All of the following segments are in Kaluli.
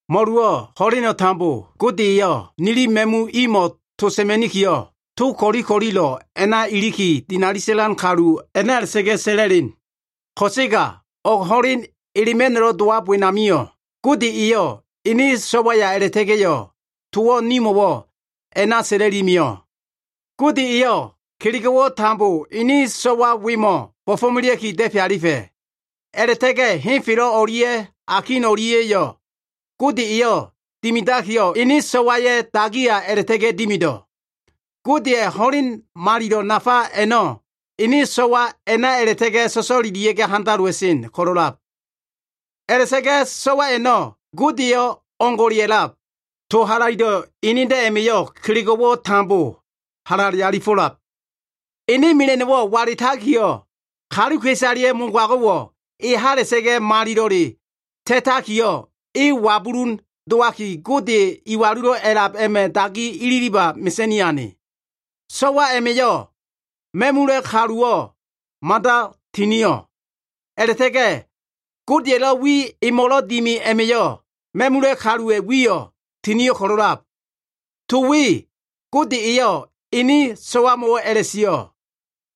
Mo꞉luwo꞉ ho꞉leno꞉ tambo Gode eyo꞉ nili ma꞉mu imo꞉ to sa꞉ma꞉nikiyo꞉, togo꞉ ko꞉li ko꞉lilo꞉ a꞉na iliki, dinali sa꞉lan kalu a꞉na a꞉la꞉ta꞉ga꞉ sa꞉la꞉len. Ko꞉sega o꞉g ho꞉len elema꞉no꞉lo꞉ dowab wenamio꞉, Gode eyo꞉ ene So꞉waya a꞉la꞉ta꞉ga꞉yo꞉, towo꞉ nimo꞉wo꞉ a꞉na sa꞉la꞉li mio꞉. Gode eyo꞉ kelego꞉wo꞉ tambo ene so꞉wa wemo꞉ bo꞉fo꞉melea꞉ki da꞉fe alifa꞉. A꞉la꞉ta꞉ga꞉ henfelo꞉ o꞉lia꞉ akin o꞉lia꞉yo꞉ Gode eyo꞉ dimidakiyo꞉, ene So꞉waya꞉ dagiya a꞉la꞉ta꞉ga꞉ dimido꞉. Godeya꞉ ho꞉len malilo꞉ nafa a꞉no꞉ ene So꞉wa a꞉na a꞉la꞉ta꞉ga꞉ so꞉so꞉lelia꞉ga꞉ handalowa꞉sen ko꞉lo꞉lab. A꞉la꞉ta꞉ga꞉ So꞉wa a꞉no꞉ Godeyo꞉ o꞉ngo꞉le a꞉lab. To halaido꞉ enedo꞉ a꞉ma꞉yo꞉ kelego꞉wo꞉ tambo halale alifo꞉lab. Ene mela꞉no꞉wo꞉ wala꞉takiyo꞉, kaluka꞉isaleya꞉ mogago꞉wo꞉ e hala꞉sa꞉ga꞉ malilo꞉ ta꞉ta꞉ga꞉yo꞉, e wabulun dowaki Gode Iwalulo꞉ A꞉lab a꞉ma꞉ dagi ililiba mesa꞉ni ane. So꞉wa a꞉ma꞉yo꞉ ma꞉mula꞉ kaluwo꞉ mada tinio꞉. A꞉la꞉ta꞉ga꞉ Godeya꞉lo꞉ wi emo꞉lo꞉ dimi a꞉ma꞉yo꞉ ma꞉mula꞉ kaluwa꞉ wiyo꞉ tinio꞉ ko꞉lo꞉lab. To we Gode eyo꞉ ene So꞉wamo꞉wo꞉ a꞉la꞉sio꞉,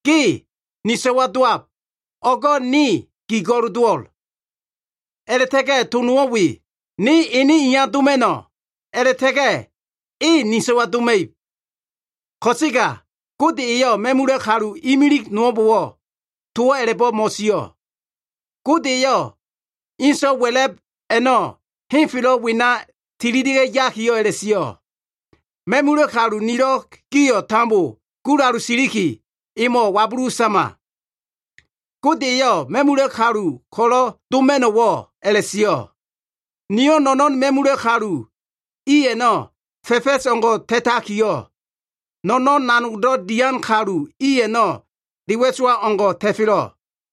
“Ge ni So꞉wa dowab. O꞉go꞉ ne gi go꞉l dowo꞉l.” A꞉la꞉ta꞉ga꞉ to nowo꞉ we, “Ne ene iya doma꞉no꞉, a꞉la꞉ta꞉ga꞉ E ni So꞉wa doma꞉ib.” Ko꞉sega Gode eyo꞉ ma꞉mula꞉ kalu imilig nowo꞉mbo꞉wo꞉ towo꞉ a꞉la꞉bo꞉ mo꞉sio꞉. Gode eyo꞉ kalu so꞉wa wa꞉la꞉b a꞉no꞉ henfelo꞉ wena tililia꞉ yakiyo꞉ a꞉la꞉sio꞉, “Ma꞉mula꞉ kalu nilo꞉ gio꞉ tambo gulalu siliki, emo꞉ wabulu sama.” Gode eyo꞉ ma꞉mula꞉ kalu ko꞉lo꞉ doma꞉no꞉wo꞉ a꞉la꞉sio꞉, “Niyo꞉ no꞉no꞉n ma꞉mula꞉ kalu i a꞉no꞉ fa꞉fa꞉s o꞉ngo꞉ ta꞉takiyo꞉, No꞉no꞉n nanogdo꞉ dian kalu i a꞉no꞉ de wa꞉sowa o꞉ngo꞉ ta꞉felo꞉.”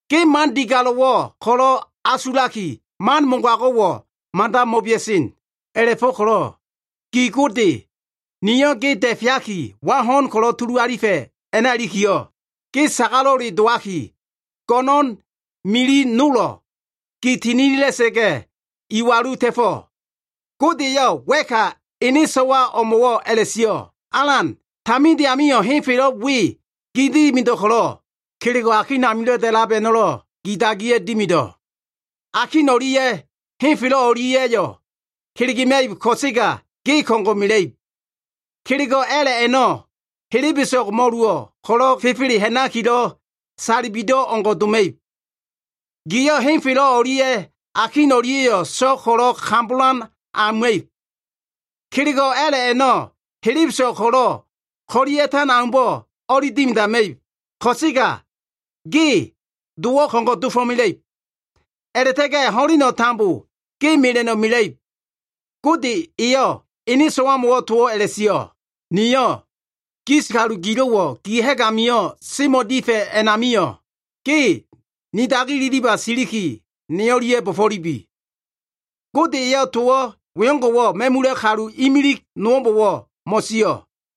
Ge man digalo꞉wo꞉ ko꞉lo꞉ asulaki, man mogago꞉wo꞉ mada mo꞉bea꞉sen. A꞉la꞉fo꞉ko꞉lo꞉ gi Gode niyo꞉ ge da꞉feaki, wa ho꞉n ko꞉lo꞉ tulu alifa꞉ a꞉na ilikiyo꞉, ge sagalo꞉le dowaki, go꞉no꞉n miliyo꞉ tambo gi tininila꞉sa꞉ga꞉, iwalu ta꞉fo꞉.” Gode eyo꞉ wa꞉ka ene So꞉wa o꞉mo꞉wo꞉ a꞉la꞉sio꞉, “Alan, taminde amio꞉ henfelo꞉ we gi dimido꞉ ko꞉lo꞉, Kelego꞉ akin amilo꞉ da꞉lab a꞉no꞉lo꞉ gi dagiya꞉ dimido꞉. Akin o꞉lia꞉ henfelo꞉ o꞉lia꞉yo꞉ kelegema꞉ib ko꞉sega, ge ko꞉ngo꞉ mela꞉ib. Kelego꞉ a꞉la꞉ a꞉no꞉ helebeso꞉g mo꞉luwo꞉ ko꞉lo꞉ fefele ha꞉nakilo꞉ salibido꞉ o꞉ngo꞉ doma꞉ib. Giyo꞉ henfelo꞉ o꞉lia꞉ akin o꞉lia꞉yo꞉ so꞉g ko꞉lo꞉ kambolan auma꞉ib. Kelego꞉ a꞉la꞉ a꞉no꞉ helebeso꞉g ko꞉lo꞉ ko꞉li a꞉ta꞉tan aumbo꞉ o꞉li dimidama꞉ib. Ko꞉sega ge dowo꞉ ko꞉ngo꞉ dofo꞉mela꞉ib. A꞉la꞉ta꞉ga꞉ ho꞉leno꞉ tambo ge mela꞉no꞉ mela꞉ib.” Gode eyo꞉ ene So꞉wamo꞉wo꞉ towo꞉ a꞉la꞉sio꞉, “Niyo꞉ gis kalu gilo꞉wo꞉ gi ha꞉g amio꞉ semo꞉ difa꞉ a꞉namio꞉, ge ni dagi ililiba siliki, ne o꞉lia꞉ bo꞉fo꞉lubi.” Gode eyo꞉ to wengo꞉wo꞉ ma꞉mula꞉ kalu imilig nowo꞉mbo꞉wo꞉ mo꞉sio꞉.